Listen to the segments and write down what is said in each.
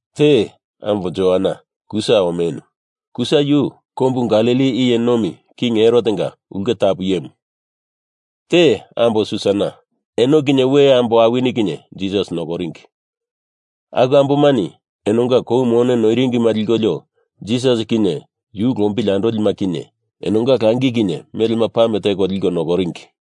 Te, ambo Joana, Kusa omenu. Kusa yu kombu Galili iye nomi King Herotenga ulke tapu iyemu. Te, ambo Susana. Eno kinye we ambo awini kinye Jisas nokoringi. Aku ambomani enonga kou mone noiringima likolio Jisas kinye yu lombili andolima kinye enonga langi kinye melema pame teko liko nokoringi.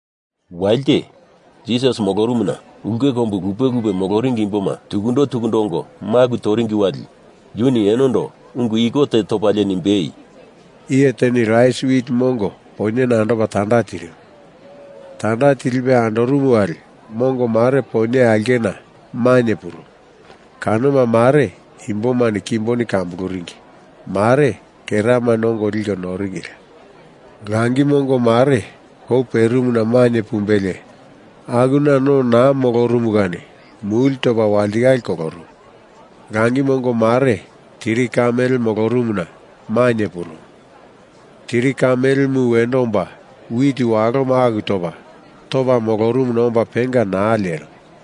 Walite Jisas molorumuna ulke kombu lupe lupe moloringi imboma tukundo tukundo ongo, maku toringi wali yuni enondo ungu iko te topalie nimbei, “Iye teni rais wit mongo poinyena andopa tanda tirimu. Tanda tilipe andorumu wali mongo mare poinye aulkena mainye purumu kanoma mare imbomani kimboni kambuluringi, mare keramani ongo liko noringila. Langi mongo mare kou perimuna mainye pumbelie akuna no naa molorumu kani muli topa walitikale kolorumu. Langi mongo mare tiri ka mele molorumuna mainye purumu. Tiri ka melemu wendo omba wit waloma aku topa, topa norumuna omba penga naa lerimu.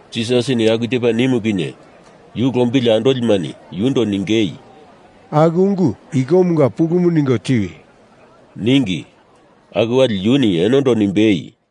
Jisasini aku tepa nimu kinye yu lombili andolimani yundo ningei, “Aku ungu ikomunga pulumu ningo tiwi!” ningi. Aku wali yuni enondo nimbei,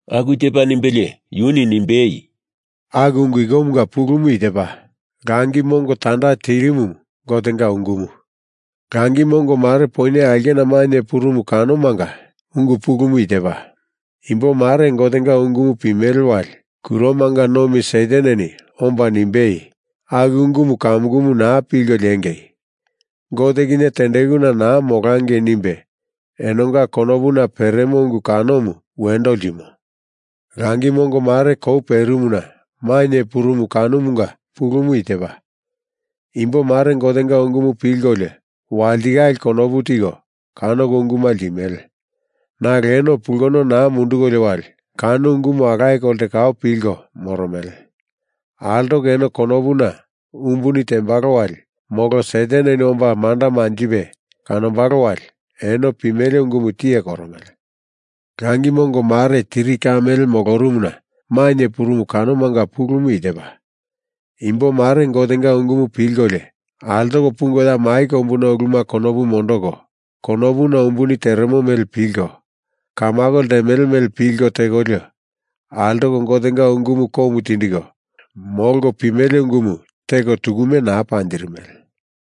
Aku tepa nimbelie yuni nimbei, “Aku ungu ikomunga pulumu i tepa: Langi mongo tanda tirimumu Gotenga ungumu. Langi mongo mare poinye aulkena mainye purumu kanomanga ungu pulumu i tepa: Imbo mare Gotenga ungumu pimele wali kuromanga nomi Sataneni omba nimbei, aku ungumu kamukumu naa pilko liengei! Gote kinye tendekuna naa molangei nimbe enonga konopuna peremo ungu kanomu wendo ltimo. Langi mongo mare kou perimuna mainye purumu kanomanga pulumu i tepa: Imbo mare Gotenga ungumu pilkolio walitikale konopu tiko kano unguma ltimele. Nalo eno pulkono naa mundukolio wali kano ungumu alaye kolte kau pilko moromele. Altoko eno konopuna umbuni tembalo wali molo Sataneni omba manda manjipe kanombalo wali, eno pimele ungumu tiye koromele. Langi mongo mare tiri ka mele molorumuna mainye purumu kanomanga pulumu i tepa: Imbo mare Gotenga ungumu pilkolio altoko pungo ya mai kombuna uluma konopu mondoko, konopuna umbuni teremo mele pilko, kamako ltemele mele pilko tekolio, altoko Gotenga ungumu komu tindiko molko pimele ungumu teko tukume naa panjirimele.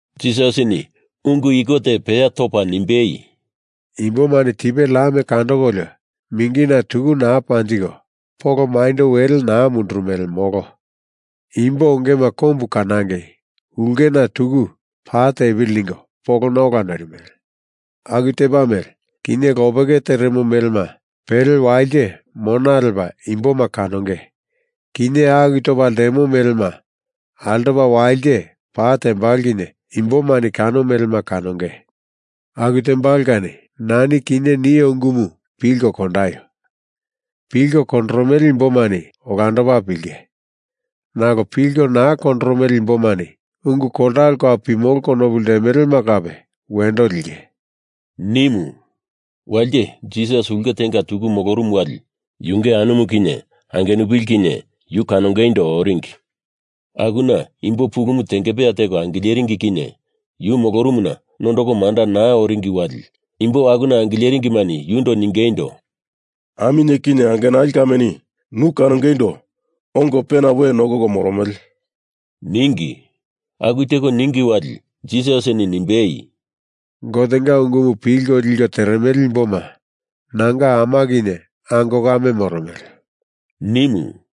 Jisasini ungu iko te peya topa nimbei, “Imbomani tipe lam kandokolio mingina tuku naa panjiko polo maindo wele naa mondoromele, molo. Imbo ongema kombu kanangei ulkena tuku pa tepili ningo polona ola noirimele. Aku tepa mele, kinye lopeke teremo melema pele walite mona lepa imboma kanonge. Kinye aku topa ltemo melema altopa walite pa tembalo kinye imbomani kano melema kanonge. Aku tembalo kani nani kinye nio ungumu pilko kondaio! Pilko kondoromele imbomani olandopa pilinge, nalo pilko naa kondoromele imbomani ungu koltalo kau pimolo konopu ltemelema kape wendo linge,” nimu. Walite Jisas ulke tenga tuku molorumu wali yunge anumu kinye angenupili kinye yu kanongeindo oringi. Akuna imbo pulumu tengepeya teko angileringi kinye yu molorumuna nondoko manda naa oringi wali imbo akuna angileringimani yundo ningeindo, “Aminye kinye angenali kameni nu kanongeindo ongo pena we nokoko moromele,” ningi. Aku teko ningi wali Jisasini nimbei, “Gotenga ungumu pilko liko teremele imboma nanga ama kinye ango kame moromele,” nimu.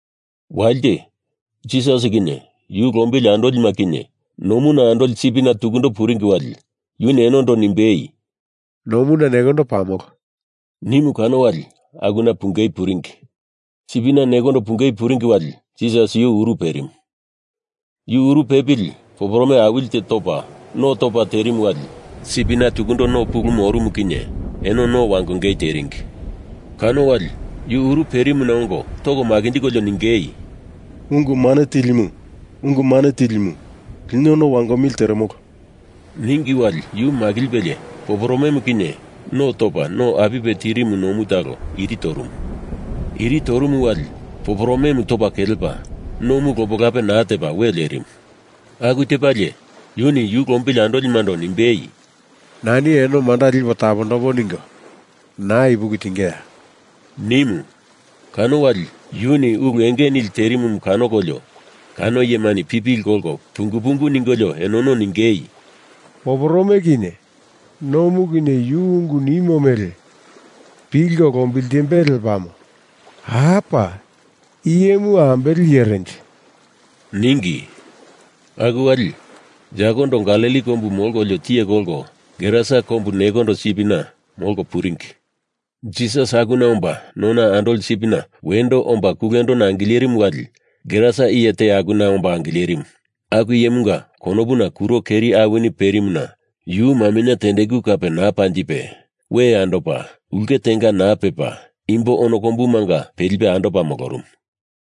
Walite, Jisas kinye yu lombili andolima kinye nomuna andoli sipina tukundo puringi wali, yuni enondo nimbei, “Nomuna nekondo pamolo,” nimu kano wali akuna pungei puringi. Sipina nekondo pungei puringi wali Jisas yu uru perimu. Yu uru pepili poporome awili te topa, no topa terimu wali sipina tukundo no pulumu orumu kinye eno no wangongei teringi. Kano wali yu uru perimuna ongo toko makinjikolio ningei, “Ungu Mane Tilimu, Ungu Mane Tilimu, lino no wangomili teremolo,” ningi wali yu makilipelie poporomemu kinye no topa no apipe tirimu nomu talo iri torumu. Iri torumu wali poporomemu topa kelepa, nomu lope lape naa tepa we lerimu. Aku tepalie yuni yu lombili andolimando nimbei, “Nani eno manda lipo tapondombo ningo naa ipuki tingeya?” nimu. Kano wali yuni ulu enge nili terimumu kanokolio kano iyemani pipili kolko pungu pungu ningolio enono ningei, “Poporome kinye nomu kinye yu ungu nimo mele pilko lombiltimbele lepamo. Apa! I iyemu ambele iyerenje?” ningi. Aku wali yakondo Galili kombu molkolio tiye kolko Gerasa kombu nekondo sipina molko puringi. Jisas akuna omba nona andoli sipina wendo omba kulendona angilerimu wali Gerasa iye te akuna omba angilerimu. Aku iyemunga konopuna kuro keri awini perimuna yu maminye tendeku kape naa panjipe, we andopa, ulke tenga naa pepa, imbo ono kombumanga pelipe andopa molorumu.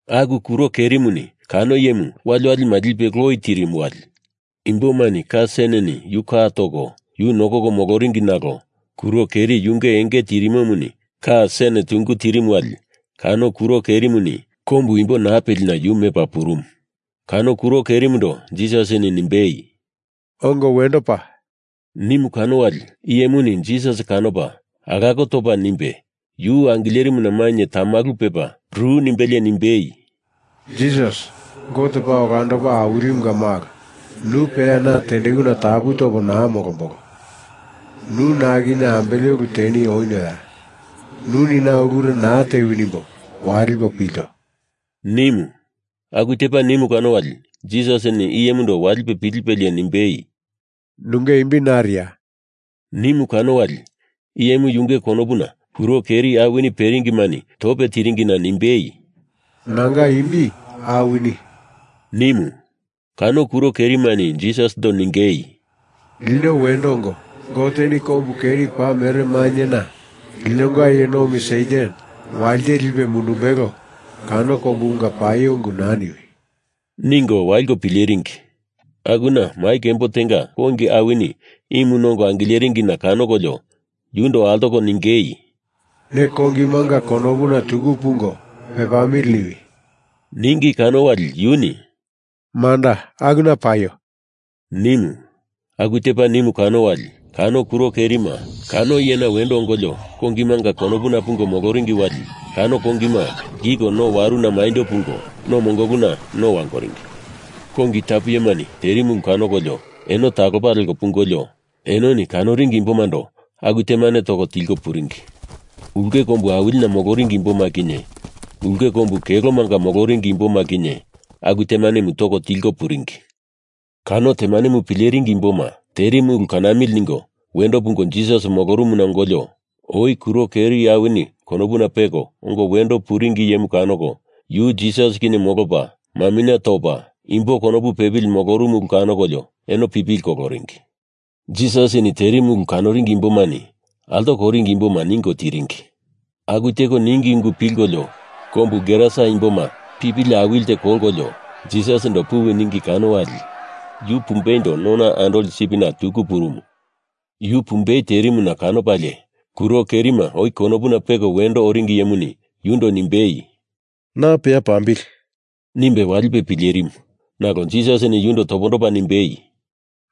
Aku kuro kerimuni kano iyemu waliwali lipo loi tirimu wali imbomani ka seneni yu ka toko yu nokoko moloringi nalo kuro keri yunge enge tirimomuni ka sen tungu tirimu wali kano kuro kerimuni kombu imbo naa pelina yu mepa purumu. Kano kuro kerimundo Jisasini nimbei, “Ongo wendo pa!” nimu kano wali iyemuni Jisas kanopa alako topa nimbe yu angilerimuna mainye tamalu pepa ru nimbelie nimbei, “Jisas, Gote Paa Olandopa Awilimunga Malo, nu peya na tendekuna tapu topo naa molombolo. Nu na kinye ambele ulu teni onioya? Nuni na ulure naa tewi nimbo walipo pilto,” nimu. Aku tepa nimu kano wali Jisasini iyemundo walipe pilipelie nimbei, “Nunge imbi nariya?” nimu kano wali iyemu yunge konopuna kuro keri awini peringimani tope tiringina nimbei, “Nanga imbi Awini,” nimu. Kano kuro kerimani Jisasindo ningei, “Lino wendo ongo, Goteni kombu keri paa mere mainyena linonga iye nomi Satan walite lipe mundumbelo kano kombumunga paio ungu naa niwi!” ningo waliko pileringi. Akuna mai kembo tenga kongi awini imu nongo angileringina kanokolio yundo altoko ningei, “Ne kongimanga konopuna tuku pungo pepamili niwi,” ningi kano wali yuni “Manda, akuna paio!” nimu. Aku tepa nimu kano wali kano kuro kerima kano iyena wendo ongolio kongimanga konopuna pungo moloringi wali kano kongima lkiko no waruna maindo pungo no mongoluna no wangoringi. Kongi tapu iyemani terimu ulu kanokolio eno talopa leko pungolio, enoni kanoringi imbomando aku temanemu toko tilko puringi. Ulke kombu awilina moloringi imboma kinye ulke kombu kelomanga moloringi imboma kinye aku temanemu toko tilko puringi. Kano temanemu pileringi imboma terimu ulu kanamili ningo wendo pungo Jisas molorumuna ongolio oi kuro keri awini konopuna peko ongo wendo puringi iyemu kanoko, yu Jisas kinye molopa, maminye topa, imbo konopu pepili molorumu ulu kanokolio eno pipili koloringi. Jisasini terimu ulu kanoringi imbomani altoko oringi imboma ningo tiringi. Aku teko ningi ungu pilkolio, kombu Gerasa imboma pali pipili awili teko kolkolio Jisasindo puwi ningi kano wali yu pumbeindo nona andoli sipina tuku purumu. Yu pumbei terimuna kanopalie kuro kerima oi konopuna peko wendo oringi iyemuni yundo nimbei, “Na peya pambili!” nimbe walipe pilerimu. Nalo Jisasini yundo topondopa nimbei,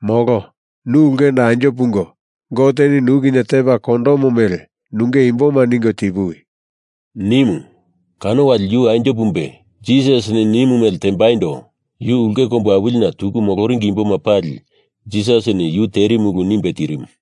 “Molo. Nu ulkendo anjo pungo Goteni nu kinye tepa kondomo mele nunge imboma ningo tipuwi!” nimu. Kano wali yu anjo pumbe Jisasini nimu mele tembaindo yu ulke kombu awilina tuku moloringi imboma pali Jisasini yu terimu ulu nimbe tirimu.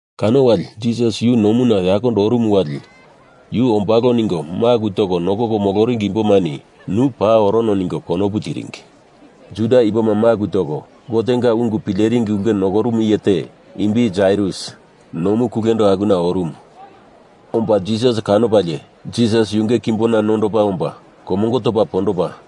Kano wali Jisas yu nomuna yakondo orumu wali yu ombalo ningo maku toko nokoko moloringi imbomani nu paa orono ningo konopu tiringi. Juda imboma maku toko Gotenga ungu pileringi ulke nokorumu iye te, imbi Jairus, nomu kulendo akuna orumu. Omba Jisas kanopalie Jisas yunge kimbona nondopa omba komongo topa pondopa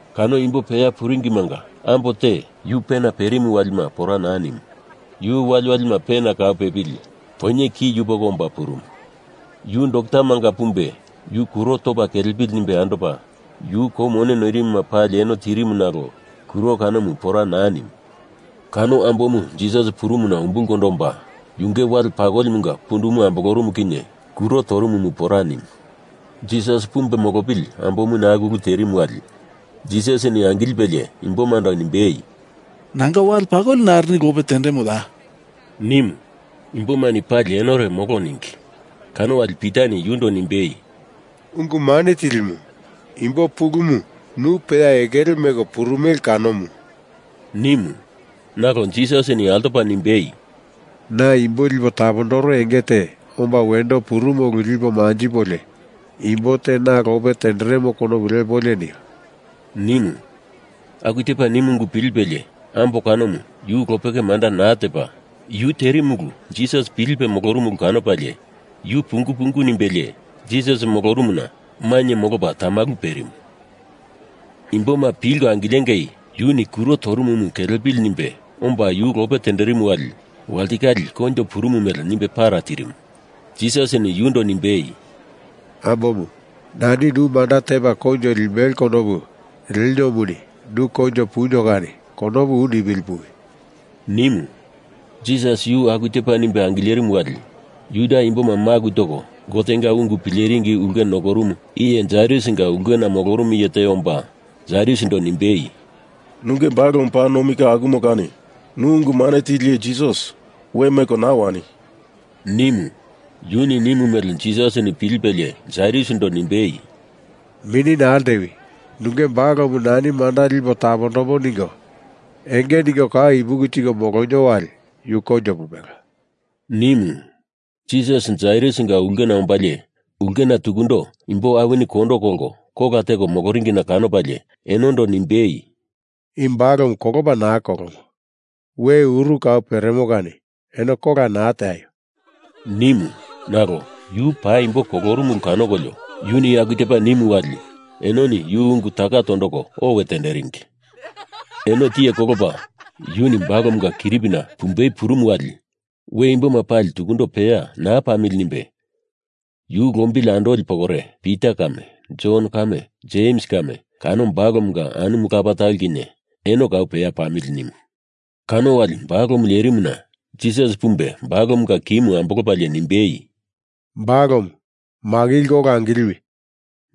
Kano imbo peya puringimanga ambo te yu pena perimu walima pora naa nimu. Yu waliwali pena kau pepili poinye ki yupoko omba purumu. Yu doktamanga pumbe yu kuro topa kelepili nimbe andopa, yu kou mone noirimuma pali eno tirimu nalo kuro kanomu pora naa nimu. Kano ambomu Jisas purumuna umbulkondo omba, yunge wale pakolimunga pundumu ambolorumu kinye kuro torumumu pora nimu. Jisas pumbe molopili ambomuni aku ulu terimu wali Jisasini angilipelie imbomando nimbei, “Nanga wale pakoli narini lope tendemoya?” nimu. Imbomani pali enore molo ningi, kano wali Pitani yundo nimbei, “Ungu Mane Tilimu, imbo pulumu nu peya ekele meko purumele kanomu,” nimu. Nalo Jisasini altopa nimbei, “Na imbo lipo tapondoro enge te omba wendo purumo ulu lipo manjipolio imbo te na lope tenderemo konupu lepolio nio,” nimu. Aku tepa nimu ungu pilipelie ambo kanomu yu lopeke manda naa tepa, yu terimu ulu Jisas pilipe molorumu ulu kanopalie yu pungu pungu nimbelie Jisas molorumuna mainye molopa tamalu perimu. Imboma pilko angilengei yuni kuro toromumu kelepili nimbe omba yu lope tenderimu wali walitikale koinjo purumu mele nimbe para tirimu. Jisasini yundo nimbei, “Ambomu, nani nu manda tepa koinjo limbelo konopu leniomuni nu koinjo punio kani konopu u nipili puwi,” nimu. Jisas yu aku tepa nimbe angilerimu wali Juda imboma maku toko Gotenga ungu pileringi ulke nokorumu iye Jairusinga ulkena molorumu iye te omba Jairusindo nimbei, “Nunge balomu paa kamukumu nomi ka akumo kani nu Ungu Mane Tili Jisas we meko naa wani!” nimu. Yuni nimu mele Jisasini pilipelie Jairusindo nimbei, “Mini naa ltewi nunge balomu nani manda lipo tapombo ningo enge ningo kau ipuki tiko molonio wali yu koinjo pumbelo,” nimu. Jisas Jairusinga ulkena ombalie ulkena tukundo imbo awini kondo kolko kola teko moloringina kanopalie enondo nimbei, “I balomu kolopa naa kolomo, we uru kau peremo kani eno kola naa teaio!” nimu. Nalo yu paa paimbo kolorumu ulu kanokolio, yuni aku tepa nimu wali enoni yu ungu taka tondoko owe tenderingi. Eno tiye kolopa yuni balomunga kiripina pumbei purumu wali we imboma pali tukundo peya naa pamili nimbe yu lombili andoli pokore, Pita kame, Jon kame, Jems kame, kano balomunga anumu lapa talo kinye, eno kau peya pamili nimu. Kano wali balomu lerimuna Jisas pumbe balomunga ki ambolopalie nimbei, “Balomu, makilko ola angiliwi!”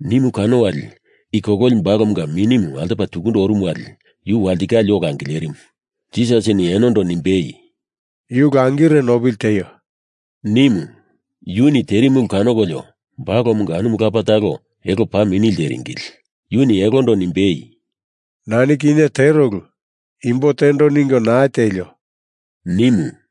nimu kano wali i kololi balomunga minimu altopa tukundo orumu wali yu walitikale ola angilerimu. Jisasini enondo nimbei, “Yu langire nopili tieio,” nimu. Yuni terimu ulu kanokolio balomunga anumu lapa talo elo paa mini lteringili. Yuni elondo nimbei, “Nani kinye tero ulu imbo tendo ningo naa tielio!” nimu.